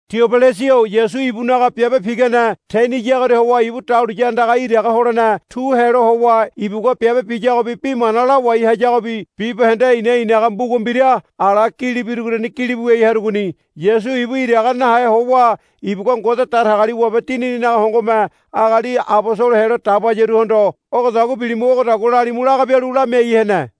Tiobilasa-o Yasu ibunaga biabe pigane teniyagoria howa ibu dahuliya andaga iraga holene tu helo howa ibugua biabe biyagobi bi mana lawai hayagobi bibahende i̱na i̱naga mbuga mbira ala gili birugoriani gilibu wiai harugoni. Yasu ibu iraga nahe howa ibugua Ngode Datagaliwabe Dinininaga hongome agali abosolo helo dabayaruhondo, Ogodagua bilimu ogodagua lalimu, laga bialu lalu lamiai hene.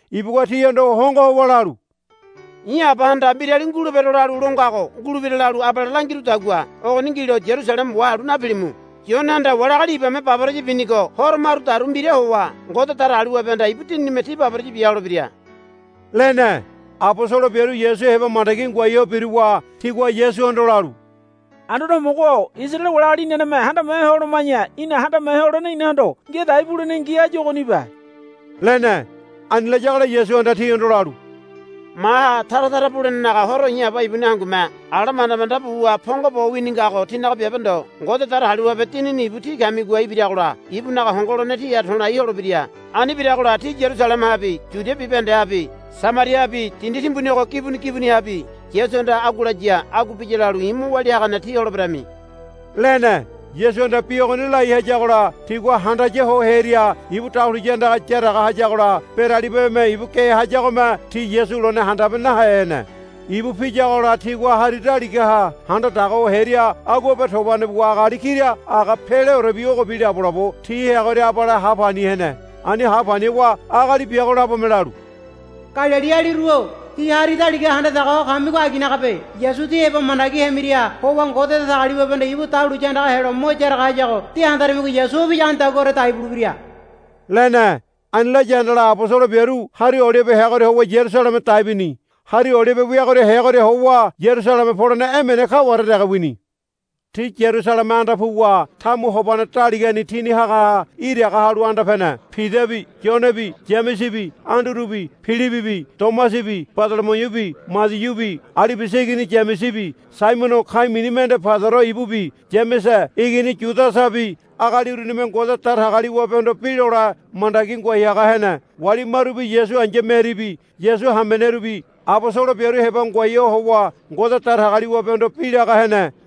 Ibugua tihondo hongo howa lalu, I̱ Abahanda mbirali ngulebero lalu lo ngago ngulebira lalu abale langirudagua ogoni ngilo Yarusaleme wahalu napilimu. Yonehanda wali agali ibame baboraya binigo horo marudaru mbira howa Ngode Datagaliwabehanda ibu Dininime tí baboraya bia holebira, lene. Abosolo biaru Yasu heba mandagi ngoai ho biruwa tigua Yasuhondo lalu, Anduane Homogo-o Isaraele wali agali inaneme handame ho holoma̱ya í̠na handame holene inahondo ngia dai bulenengi áyu ogonibe, lene. Ani layagola Yasuhanda tihondo lalu, Maha tara tara bulenenaga horo i̱ Aba ibuni hangume ala manda manda buwa pongo bo wini ngago tínaga biabe ndo. Ngode Datagaliwabe Dinini ibu tí kamigoha ibiragola ibunaga hongo holene tíha to̱lai holebira. Ani biragola tí Yarusalemehabi Yudia bibahendehabi Samariahabi dindi timbuni ogo gibuni gibunihabi Yasuhanda agua laya agua biya lalu i̱ mo walia hagane tí holeberami, lene. Yasuhanda bi ogoni lai hayagola tigua handaya ho hearia ibu dahuliya andaga yaraga hayagola beralibame ibu ge hayagome ti Yasu lone handabe nahe hene. Ibu piyagola tigua hari daligaha handa daga ho hearia aguabe tobane buwa agali kira aga peleorebi ogobi labolabo ti heagoria abale ha pani hene. Ani ha pani howa agali biago labome lalu, Galilialiru-o tí hari daligaha handa daga ho kamigo aginagabe. Yasu tí heba mandagi hemira howa Ngode Datagaliwabehanda ibu dahuliya andaga helo mo yaraga hayago de handarimigo Yasu o piyagonidaguaore dai bulebira, lene. Ani laya handala abosolo biaru Hari Olibe heagoria howa Yarusaleme dai bini. Hari Olibe weagoria heagoria howa Yarusaleme polene emene kaware dege wini. Ti Yarusaleme anda puwa tamu hobane daligani tini hagaha iraga halu anda pene. Pidabi Yonebi Yamesebi Andurubi Pilibibi Tomasabi Badolomiubi Madiubi Alibiasa igini Yamesebi Saimono ka̱i̱ mini mende Paidoro ibubi Yamese igini Yudasabi agali urunime Ngode Datagaliwabehondo bi lole mandagi ngoai haga hene. Wali marubi Yasu ai̱ya Meribi Yasu hamenerubi abosolo biaru heba ngoai howa Ngode Datagaliwabehondo bi laga hene.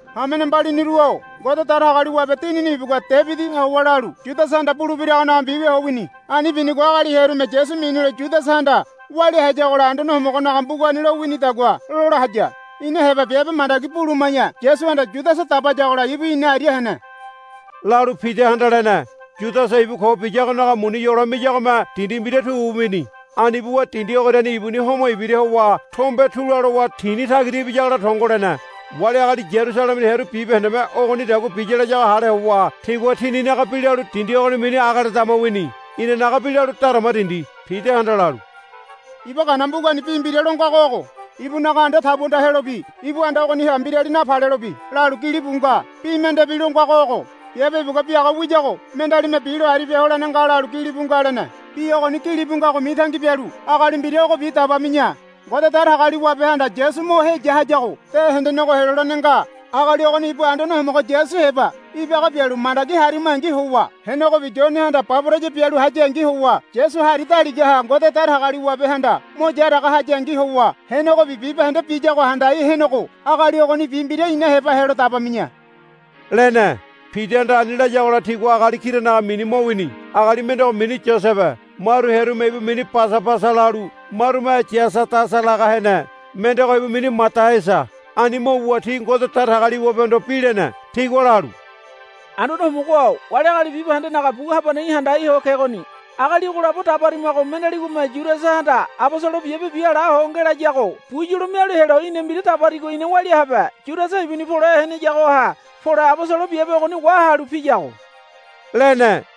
Hamene mbaliniru-o Ngode Datagaliwabe Dinini ibugua Debidiha howa lalu Yudasahanda bulebiragonaga mbiwia ho wini. Ani binigo agali hearume Yasu minilo Yudasahanda walia hayagola Anduane Homogonaga mbugani lo winidagua lola haya. Ina heba biabe mandagi buluma̱ya Yasuhanda Yudasa dabayagola ibu ina aria hene, lalu Pidahanda lene. Yudasa ibu ko biyagonaga muni yolo miyagome dindi mbira tu wini. Ani buwa dindi ogoriani ibuni homo ibira howa tombe tula lowa tini tagira ibiyagola tongo lene. Wali agali Yarusalemeni hearu bibahendeme ogonidagua biya layago hale howa tigua tininaga bi lalu dindi ogoni mini Ageledama wini. Inanaga bi lalu Darama Dindi. Pidahanda lalu, Iba Gana mbugani bi mbira lo ngago ogo, Ibunaga anda tabuanda helobi ibu anda ogoniha mbirali napalelobi, lalu gilibu nga. Bi mendebi lo ngago ogo, Biabe ibugua biaga wiyago mendealime bilo aribia holene nga, lalu gilibu nga, lene. Bi ogoni gilibu ngago mitangi bialu agali mbira ogobi dabami̱ya. Ngode Datagaliwabehanda Yasu mo heya hayago de hendenego helolene nga. Agali ogoni ibu Anduane Homogo Yasu heba ibaga bialu mandagi harimangi howa henegobi Yonehanda baboraya bialu hayangi howa Yasu hari daligaha Ngode Datagaliwabehanda mo yaraga hayangi howa henegobi bibahende biyago handai henego agali ogonibi mbira ina heba helo dabami̱ya, lene. Pidahanda ani layagola tigua agali kiranaga mini mo wini. Agali mendego mini Yosebe maru hearume ibu mini Basabasa lalu marume Yasadasa laga hene. Mendego ibu mini Madaiasa. Ani mo wuwa ti Ngode Datagaliwabehondo bi lene. Tigua lalu, Anduane Homogo-o wali agali bibahendenaga bu habaneha í̠ handai ho kegoni. Agali ogo labo dabarimago mendealigome Yudasahanda abosolo biabe biala ho ngelayago bu yolo mialu helo í̠na mbira dabarigo ina walia habe. Yudasa ibuni pole heneyagoha pole abosolo biabe ogoni wahalu piyago, lene.